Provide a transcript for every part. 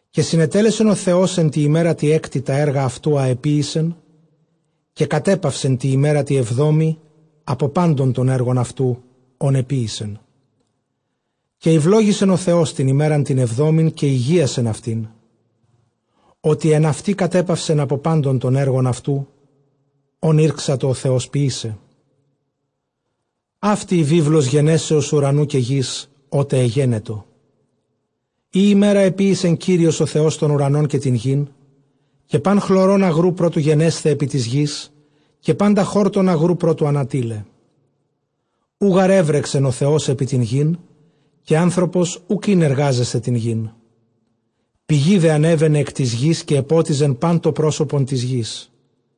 Καὶ συνετέλεσεν ὁ Θεὸς ἐν τῇ ἡμέρᾳ τῇ ἕκτῃ τὰ ἔργα αὐτοῦ, ἃ ἐποίησε· καὶ κατέπαυσε τῇ ἡμέρᾳ τῇ ἑβδόμῃ ἀπὸ πάντων τῶν ἔργων αὐτοῦ, ὧν ἐποίησε. Καὶ εὐλόγησεν ὁ Θεὸς τὴν ἡμέραν τὴν ἑβδόμην, καὶ ἡγίασεν αὐτήν, ὅτι ἐν αὐτῇ κατέπαυσεν ἀπὸ πάντων τῶν ἔργων αὐτοῦ, ὧν ἤρξατο ὁ Θεὸς ποιῆσαι. Αὕτη ἡ βίβλος γενέσεως οὐρανοῦ καὶ γῆς, ὅτε ἐγένετο, ᾗ ἡμέρᾳ ἐποίησε Κύριος ὁ Θεὸς τὸν οὐρανὸν καὶ τὴν γῆν, καὶ πᾶν χλωρὸν ἀγροῦ πρὸ τοῦ γενέσθαι ἐπὶ τῆς γῆς, καὶ πάντα χόρτον ἀγροῦ πρὸ τοῦ ἀνατεῖλαι· οὐ γὰρ ἔβρεξεν ὁ Θεὸς ἐπὶ τὴν γῆν, καὶ ἄνθρωπος οὐκ ἦν ἐργάζεσθαι αὐτήν. Πηγὴ δὲ ἀνέβαινεν ἐκ τῆς γῆς, καὶ ἐπότιζε πᾶν τὸ πρόσωπον τῆς γῆς.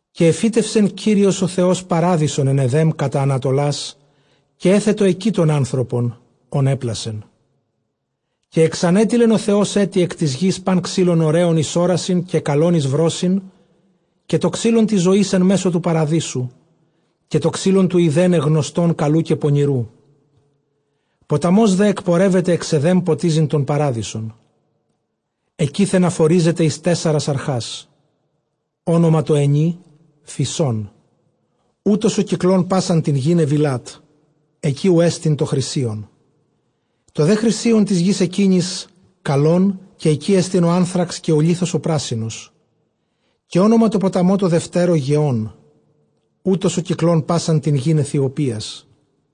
Καὶ ἐφύτευσεν ὁ Θεὸς παράδεισον ἐν Ἐδὲμ κατὰ ἀνατολάς· καὶ ἔθετο ἐκεῖ τὸν ἄνθρωπον, ὃν ἔπλασε. Καὶ ἐξανέτειλεν ὁ Θεὸς ἔτι ἐκ τῆς γῆς πᾶν ξύλον ὡραῖον εἰς ὅρασιν, καὶ καλὸν εἰς βρῶσιν, καὶ τὸ ξύλον τῆς ζωῆς ἐν μέσῳ τοῦ παραδείσου, καὶ τὸ ξύλον τοῦ εἰδέναι γνωστὸν καλοῦ καὶ πονηροῦ. Ποταμὸς δὲ ἐκπορεύεται ἐξ Ἐδὲμ ποτίζειν τὸν παράδεισον· ἐκεῖθεν ἀφορίζεται εἰς τέσσαρας ἀρχάς. Ὄνομα τῷ ἑνὶ, Φισῶν· οὗτος ὁ κυκλῶν πᾶσαν τὴν γῆν Εὐιλάτ· ἐκεῖ οὗ ἐστι τὸ χρυσίον. Τὸ δὲ χρυσίον τῆς γῆς ἐκείνης καλόν· καὶ ἐκεῖ ἐστιν ὁ ἄνθραξ, καὶ ὁ λίθος ὁ πράσινος. Καὶ ὄνομα τῷ ποταμῷ τῷ δευτέρῳ, Γεῶν· οὗτος ὁ κυκλῶν πᾶσαν τὴν γὴν Αἰθιοπίας.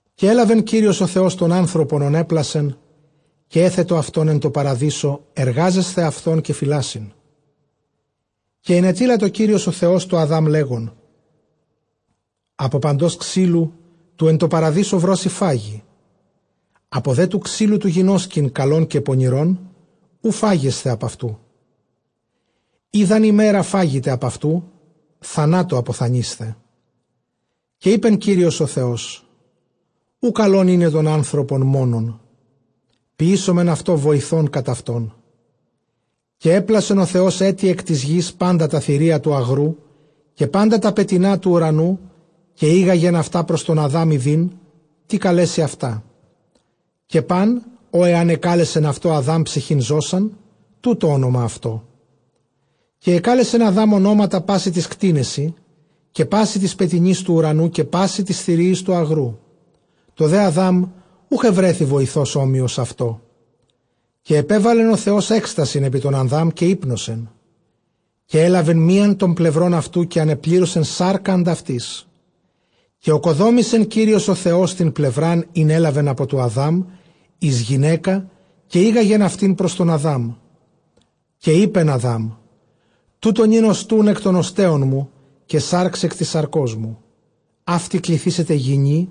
Καὶ ἔλαβε Κύριος ὁ Θεὸς τὸν ἄνθρωπον ὃν ἔπλασε, καὶ ἔθετο αὐτὸν ἐν τῷ παραδείσῳ τῆς τρυφῆς, ἐργάζεσθαι αὐτὸν καὶ φυλάσσειν. Καὶ ἐνετείλατο Κύριος ὁ Θεὸς τῷ Ἀδὰμ, λέγων, ἀπὸ παντὸς ξύλου τοῦ ἐν τῷ παραδείσῳ βρώσει φαγῇ. Ἀπὸ δὲ τοῦ ξύλου τοῦ γινώσκειν καλὸν καὶ πονηρὸν, οὐ φάγεσθε ἀπʼ αὐτοῦ· ᾗ δʼ ἂν ἡμέρᾳ φάγητε ἀπʼ αὐτοῦ, θανάτῳ ἀποθανεῖσθε. Καὶ εἶπε Κύριος ὁ Θεὸς, οὐ καλὸν εἶναι τὸν ἄνθρωπον μόνον· ποιήσωμεν αὐτῷ βοηθὸν κατʼ αὐτόν. Καὶ ἔπλασεν ὁ Θεὸς ἔτι ἐκ τῆς γῆς πάντα τὰ θηρία τοῦ ἀγροῦ, καὶ πάντα τὰ πετεινὰ τοῦ οὐρανοῦ· καὶ ἤγαγεν αὐτὰ πρὸς τὸν Ἀδὰμ, ἰδεῖν τί καλέσει αὐτά· καὶ πᾶν ὃ ἐὰν ἐκάλεσεν αὐτὸ Ἀδὰμ ψυχὴν ζῶσαν, τοῦτο ὄνομα αὐτῷ. Καὶ ἐκάλεσεν Ἀδὰμ ὀνόματα πᾶσι τοῖς κτήνεσι, καὶ πᾶσι τοῖς πετεινοῖς τοῦ οὐρανοῦ, καὶ πᾶσι τοῖς θηρίοις τοῦ ἀγροῦ· τῷ δὲ Ἀδὰμ οὐχ εὑρέθη βοηθὸς ὅμοιος αὐτῷ. Καὶ ἐπέβαλεν ὁ Θεὸς ἔκστασιν ἐπὶ τὸν Ἀδὰμ, καὶ ὕπνωσε· καὶ ἔλαβε μίαν τῶν πλευρῶν αὐτοῦ, καὶ ἀνεπλήρωσε σάρκα ἀντʼ αὐτῆς. Καὶ ᾠκοδόμησεν ὁ Θεὸς τὴν πλευρὰν, ἣν ἔλαβεν ἀπὸ τοῦ Ἀδὰμ εἰς γυναῖκα· καὶ ἤγαγεν αὐτὴν πρὸς τὸν Ἀδάμ. Καὶ εἶπεν Ἀδάμ· τοῦτο νῦν ὀστοῦν ἐκ τῶν ὀστέων μου, καὶ σὰρξ ἐκ τῆς σαρκός μου· αὕτη κληθήσεται γυνὴ,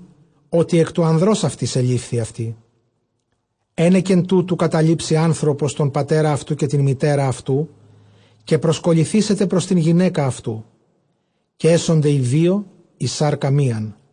ὅτι ἐκ τοῦ ἀνδρὸς αὐτῆς ἐλήφθη. Ἕνεκεν τούτου καταλείψει ἄνθρωπος τὸν πατέρα αὐτοῦ καὶ τὴν μητέρα, καὶ προσκολληθήσεται πρὸς τὴν γυναῖκα αὐτοῦ· καὶ ἔσονται οἱ δύο εἰς σάρκα μίαν.